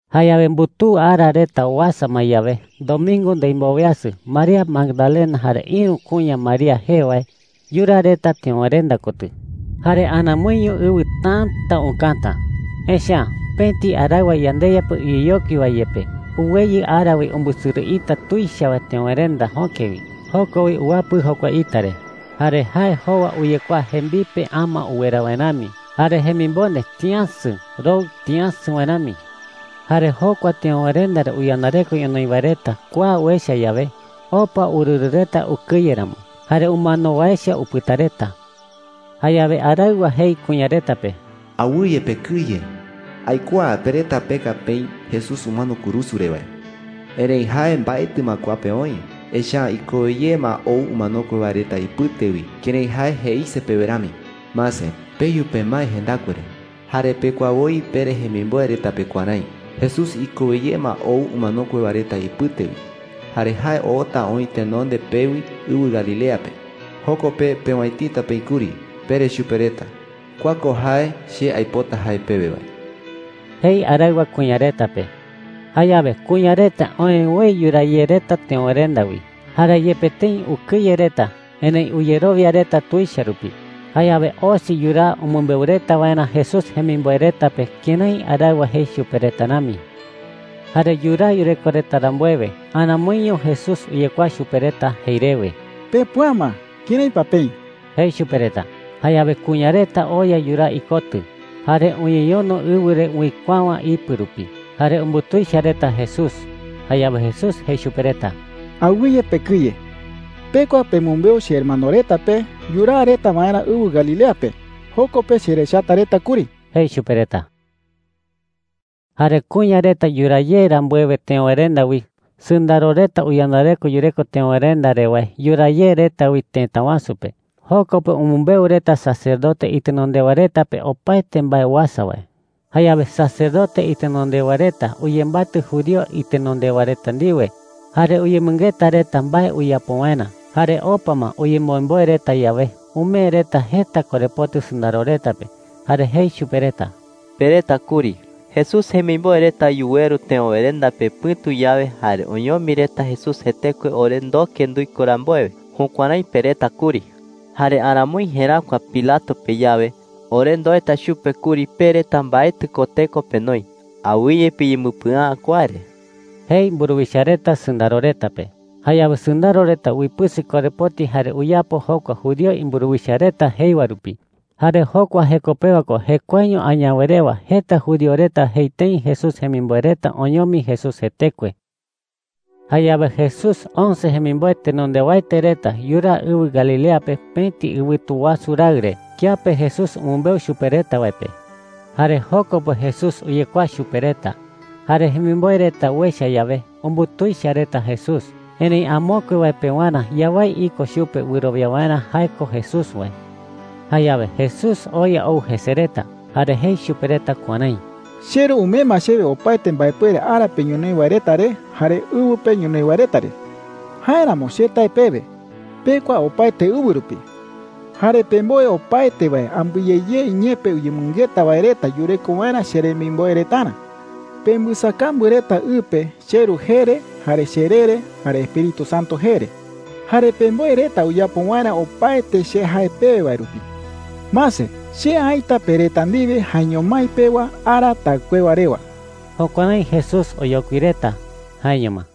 Jayawe mbutuu ara reta uasa ma yawe, domingo ndimboweasɨ, María Magdalena jare ïru kuña María jee wae yuraa reta teöwerenda kotɨ. Jare aramoiño ɨwɨ täta ukäta. Echa’ä pëti araɨwa yandeYa pe uyeyokui wae yepe uweyɨ ara wi umbɨsɨrɨ ita tuicha wae teöwerenda jöke wi. Joko wi uwapɨ jokua ita re. Jare jae jowa uyekuaa jembipe ama uwera wae rami. Jare jemimonde tïasɨ, roɨ tïasɨ wae rami. Jare jokua teöwerenda re uyandareko ñonoï wae reta kua uecha yawe, opa urɨrɨ reta ukɨye ramo. Jare umano wae echa upɨta reta. Jayawe araɨwa jei kuña reta pe: “Awɨye pekɨye,” jei. “Aikuaa pe reta peka peï Jesús umano kurusu re wae. Erëi jae mbaetɨ ma kua pe oï. Echa’ä ikowe ye ma ou umanokue wae reta ipɨte wi kërái jae jeise pewe rami. Mase, peyu pemae jendakue re,” jei. “Jare pekua woi pere jemimboe reta pe kuärái: ‘Jesús ikowe ye ma ou umanokue wae reta ipɨte wi, jare jae oota oï tenonde pewi ɨwɨ Galilea pe. Joko pe peowäitita peï kuri,’ pere chupe reta. Kua ko jae che aipota jae pewe wae,” jei araɨwa kuña reta pe. Jayawe kuña reta oë woi yuraa ye reta teöwerenda wi. Jare yepe tëi ukɨye reta, erëi uyerowia reta tuicha rupi. Jayawe osi yuraa umɨmbeu reta waerä Jesús jemimboe reta pe kërái araɨwa jei chupe reta rami. Jare yuraa yureko reta rambuewe, aramoiño Jesús uyekuaa chupe reta jei rewe: “Pepüa ma, ¿kërái pa peï?” jei chupe reta. Jayawe kuña reta oya yuraa ikotɨ, jare uñeñono ɨwɨ re uikuäwa ipɨ rupi, jare umbutuicha reta Jesús. Jayawe Jesús jei chupe reta: “Awɨye pekɨye,” jei. “Pekua pemɨmbeu chehermano reta pe yuraa reta waerä ɨwɨ Galilea pe. Joko pe cherechata reta kuri,” jei chupe reta. Jare kuña reta yuraa ye rambuewe teöwerenda wi, sɨndaro reta uyandareko yureko teöwerenda re wae yuraa ye reta wi tëta wasu pe. Joko pe umɨmbeu reta sacerdote itenondewa reta pe opaete mbae uasa wae. Jayawe sacerdote itenondewa reta uyembatɨ judío itenondewa reta ndiwe jare uyemɨngeta reta mbae uyapo waerä. Jare opa ma uyemboemboe reta yawe, umee reta jeta korepoti sɨndaro reta pe. Jare jei chupe reta: “Pereta kuri, ‘Jesús jemimboe reta yuweru teöwerenda pe pɨ̈tu yawe, jare oñomi reta Jesús jetekue ore ndoke nduiko rambuewe.’ Jukuärái pereta kuri,” jei chupe reta. “Jare aramoi jeräkua Pilato pe yawe, ore ndoeta chupe kuri pe reta mbaetɨ ko teko penoi. Awɨye piyembɨpɨa’ä kua re,” jei mburuwicha reta sɨndaro reta pe. Jayawe sɨndaro reta uipɨsɨ korepoti jare uyapo jokua judío imburuwicha reta jei wae rupi. Jare jokua jeko pewa ko jekuaeño añawe rewa jeta judío reta jei tëi Jesús jemimboe reta oñomi Jesús jetekue. Jayawe Jesús once jemimboe tenondewaete reta yuraa ɨwɨ Galilea pe pëti ɨwɨtu wasu raɨ re kiape Jesús umɨmbeu chupe reta wae pe. Jare joko pe Jesús uyekuaa chupe reta. Jare jemimboe reta uecha yawe, umbutuicha reta Jesús. Erëi amokue wae pewarä yawái iko chupe wɨrowia waerä jae ko Jesús wae. Jayawe Jesús oya ou jese reta, jare jei chupe reta kuärái: “CheRu umee ma chewe opaete mbaepuere ara pe ñonoï wae reta re jare ɨwɨ pe ñonoï wae reta re,” jei chupe reta. “Jáeramo che tae pewe, pekua opaete ɨwɨ rupi. Jare pemboe opaete wae ambɨe ye ye iñee pe uyemɨngeta wae reta yureko waerä cheremimboe retarä,” jei chupe reta. “Pembɨsakambu reta ɨ pe cheRu jee re, jare cheree re, jare Espíritu Santo jee re,” jei. “Jare pemboe reta uyapo waerä opaete che jae pewe wae rupi,” jei. “Mase, che aïta pe reta ndiwe jaeño mái pewa ara taɨkuewa rewa.” Jukuärái Jesús oyokui reta. Jaeño ma.